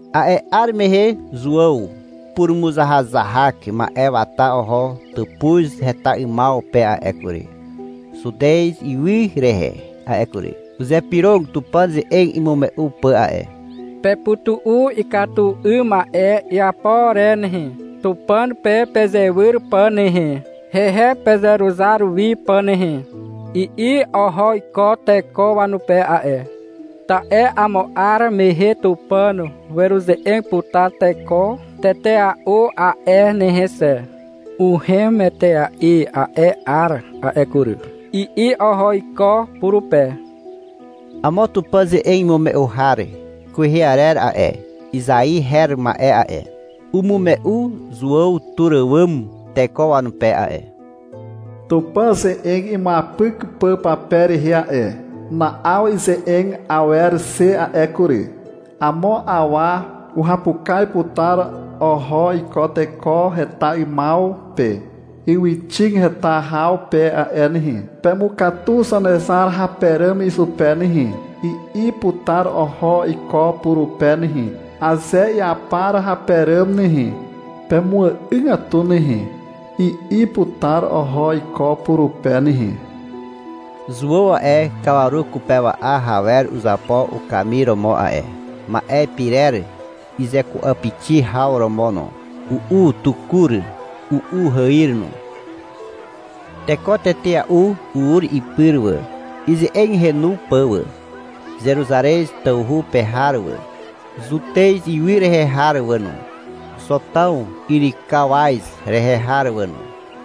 A'e 'ar mehe Zuàw purumuzahazahak ma'e wata oho tàpuz heta 'ymaw pe a'e kury, Zutez ywy rehe a'e kury. Uzypyrog Tupàn ze'eg imume'u pà a'e. — Pepytu'u ikatu 'ym ma'e iapo re nehe, Tupàn pe pezewyr pà nehe, hehe pezeruzar wi pà nehe, i'i oho iko teko wanupe a'e. — Ta'e amo 'ar mehe Tupàn weruze'eg putar teko tetea'u a'e nehe xe. Uhem etea'i a'e 'ar a'e kury, i'i oho iko purupe. Amo Tupàn ze'eg imume'u har kwehe arer a'e, Izai her ma'e a'e, umume'u Zuàw tur àwàm teko wanupe a'e, Tupàn ze'eg imuapyk pà pape rehe a'e. Na'aw ize'eg awer xe a'e kury. Amo awa uhapukaz putar oho iko Teko heta 'ymaw pe, ywyxig heta haw pe a'e nehe, — Pemukatu Zanezar hape ràm izupe nehe, i'i putar oho iko purupe nehe, — Aze iapar hape ràm nehe, pemu'àgatu nehe, I'i putar oho iko purupe nehe. Zuàw a'e, kawaru kupewa'a hawer uzapo ukamir romo a'e, ma'e pirer izeku'apixi haw romo no. U'u tukur. U'u hàir no. Teko tetea'u ur ipyr wà, ize'eg henu pà wà. Zeruzarez tawhu pe har wà, Zutez ywy rehe har wà no, Zotàw yrykawaz rehe har wà no.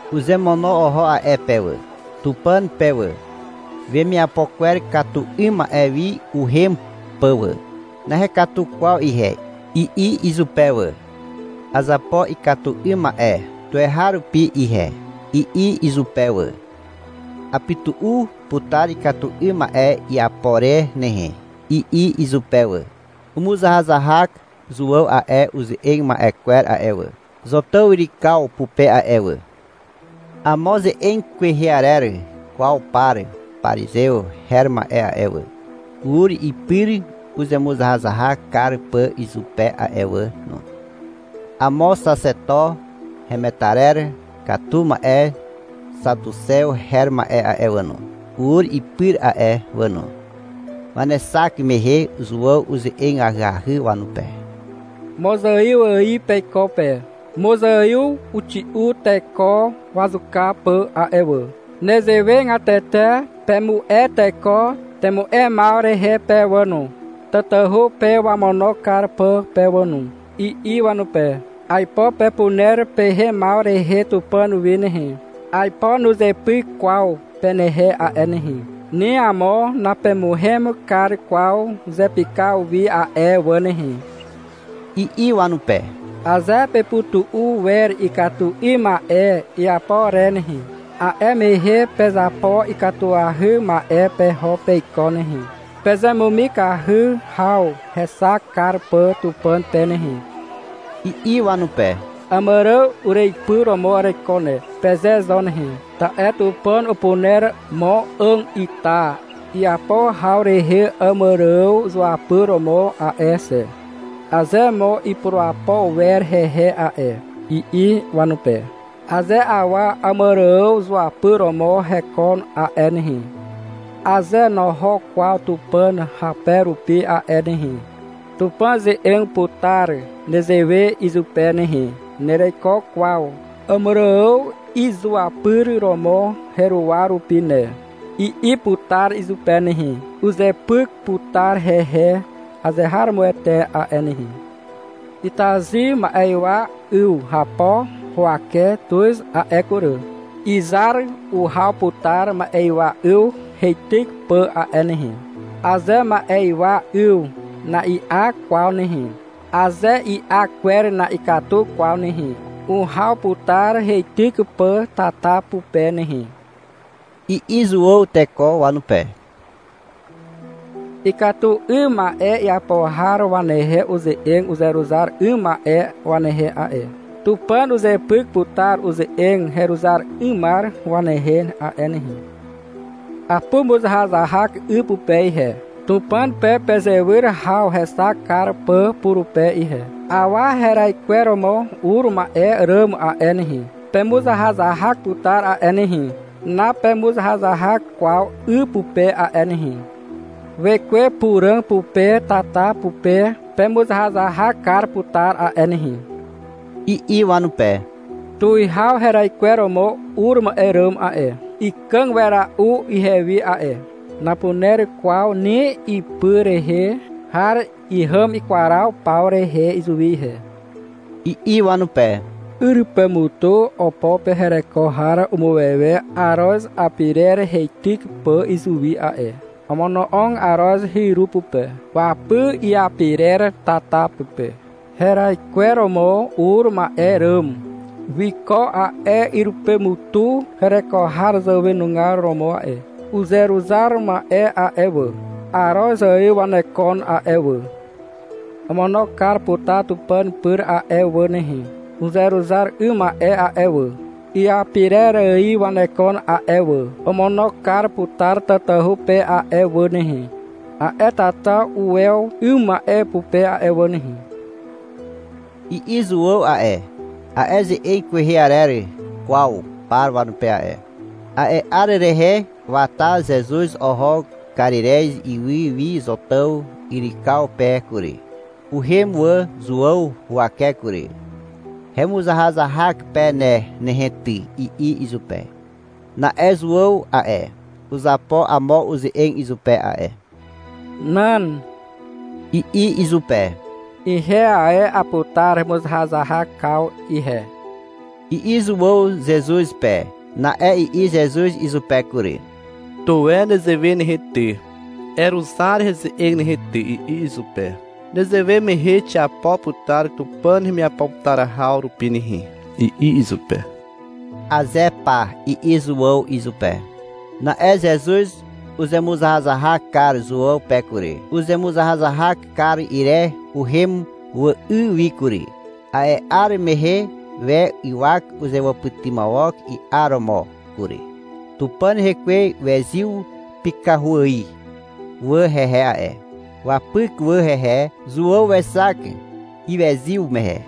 Uzemono oho a'e pe wà, Tupàn pe wà, wemiapo kwer katu 'ym ma'e wi uhem pà wà. — Nahekatu kwaw ihe, i'i izupe wà. — Azapo ikatu 'ym ma'e tuweharupi ihe, i'i izupe wà. — Apytu'u putar ikatu 'ym ma'e iapo re nehe, i'i izupe wà. Umuzahazahak Zuàw a'e uze'eg ma'e kwer a'e wà, Zotàw yrykaw pupe a'e wà. Amo ze'eg kwehe arer kwaw par parizew her ma'e a'e wà, ur ipyr uzemuzahazahak kar pà izupe a'e wà no. Amo xaxeto hemetarer katu ma'e xatuxew her ma'e a'e wà no, ur ipyr a'e wà no. Wanexak mehe Zuàw uze'eg ahyahy wanupe. — Mozaiw ài peiko pe. Mozaiw uxi'u teko wazuka pà a'e wà. Nezewegatete pemu'e teko temu'emaw rehe pe wà no, tatahu pe wamono kar pà pe wà no, i'i wanupe. — Aipo pepuner pehemaw rehe Tupàn wi nehe, aipo nuzepyk kwaw penehe a'e nehe. Ni amo napemuhem kar kwaw zepykaw wi a'e wà nehe, i'i wanupe. — Aze pepytu'u wer ikatu 'ym ma'e iapo re nehe, a'e mehe pezapo ikatuahy ma'e peho peiko nehe, pezemumikahy haw hexak kar pà Tupàn pe nehe, i'i wanupe. — Àmàrààw ureipy romo hekon a'e, peze zo nehe. — Ta'e Tupàn upuner mo 'àg ita iapo haw rehe Àmàrààw izuapyr romo a'e xe, aze mo ipurapo wer hehe a'e, i'i wanupe. — Aze awa Àmàrààw zuapyr romo hekon a'e nehe, aze noho kwaw Tupàn hape rupi a'e nehe, Tupàn uze'eg putar nezewe izupe nehe — Nereiko kwaw Àmàrààw izuapyr romo heruwa rupi ne, i'i putar izupe nehe. Uzepyk putar hehe azeharomoete a'e nehe. — Itazy ma'ywa 'yw hapo huwake tuz a'e kury. Izar uhaw putar ma'ywa 'yw heityk pà a'e nehe. Aze ma'ywa 'yw na'i'a kwaw nehe, aze i'a kwer na'ikatu kwaw nehe, uhaw putar heityk pà tata pupe nehe, i'i Zuàw teko wanupe. (Ikatu 'ym ma'e iapo har wanehe uze'eg uzeruzar 'ym ma'e wanehe a'e. Tupàn uzepyk putar uze'eg heruzar 'ymar wanehe a'e nehe.) — Apumuzahazahak 'y pupe ihe, Tupàn pe pezewyr haw hexak kar pà purupe ihe. Awa heraikweromo ur ma'e ràm a'e nehe, pemuzahazahak putar a'e nehe. Napemuzahazahak kwaw 'y pupe a'e nehe. Wekwe Puràg pupe tata pupe pemuzahazahak kar putar a'e nehe, i'i wanupe. — Tuwihaw heraikweromo ur ma'e ràm a'e, ikàg wera'u ihewi a'e. Napuner kwaw ni ipy rehe har ihàm ikwaraw paw rehe izuwi ihe, i'i wanupe. — Yrypemutu opo pe hereko har umuwewe aroz apirer heityk pà izuwi a'e. Omono'og aroz hyru pupe. Wapy iapirer tata pupe. Heraikweromo ur ma'e ràm wiko a'e yrypemutu hereko har zàwenugar romo a'e. (Uzeruzar ma'e a'e wà, aroz ài wanekon a'e wà. Omono kar putar Tupàn pyr a'e wà nehe. Uzeruzar 'ym ma'e a'e wà, iapirer ài wanekon a'e wà. Omono kar putar tatahu pe a'e wà nehe, a'e tata uwew 'ym ma'e pupe a'e wà nehe, i'i Zuàw a'e, a'e ze'eg kwehe arer kwaw par wanupe a'e). A'e 'ar rehe wata Zezuz oho Karirez ywy wi Zotàw yrykaw pe kury. Uhem wà Zuàw huwake kury. — Hemuzahazahak pe ne nehe ty, i'i izupe. Na'e Zuàw a'e, uzapo amo uze'eg izupe a'e. — Nan, i'i izupe. — Ihe ae aputar hemuzahazahakaw ihe, i'i Zuàw Zezuz pe. Na'e i'i Zezuz izupe kury. — Tuwe nezewe nehe ty, eruzar heze'eg nehe ty, i'i izupe. Nezewe mehe xiapo putar Tupàn hemiapo putar haw rupi nehe, i'i izupe. — Aze pa, i'i Zuàw izupe. Na'e Zezuz uzemuzahazahak kar Zuàw pe kury. Uzemuzahazahak kar ire, uhem wà 'y wi kury. A'e 'ar mehe we ywak uzewàpytymawok i'aromo kury. Tupàn Hekwe wezyw pykahu ài wà hehe a'e. Wapyk wà hehe. Zuàw wexak iwezyw mehe.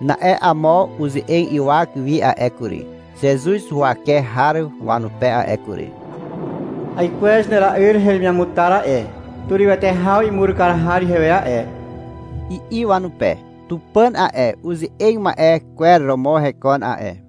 Na'e amo uze'eg ywak wi a'e kury, Zezuz huwake har wanupe a'e kury. — Aikwez hera'yr heremiamutar a'e. Turywete haw imur har ihewe a'e, i'i wanupe. (Tupàn a'e uze'eg ma'e kwer romo hekon a'e.)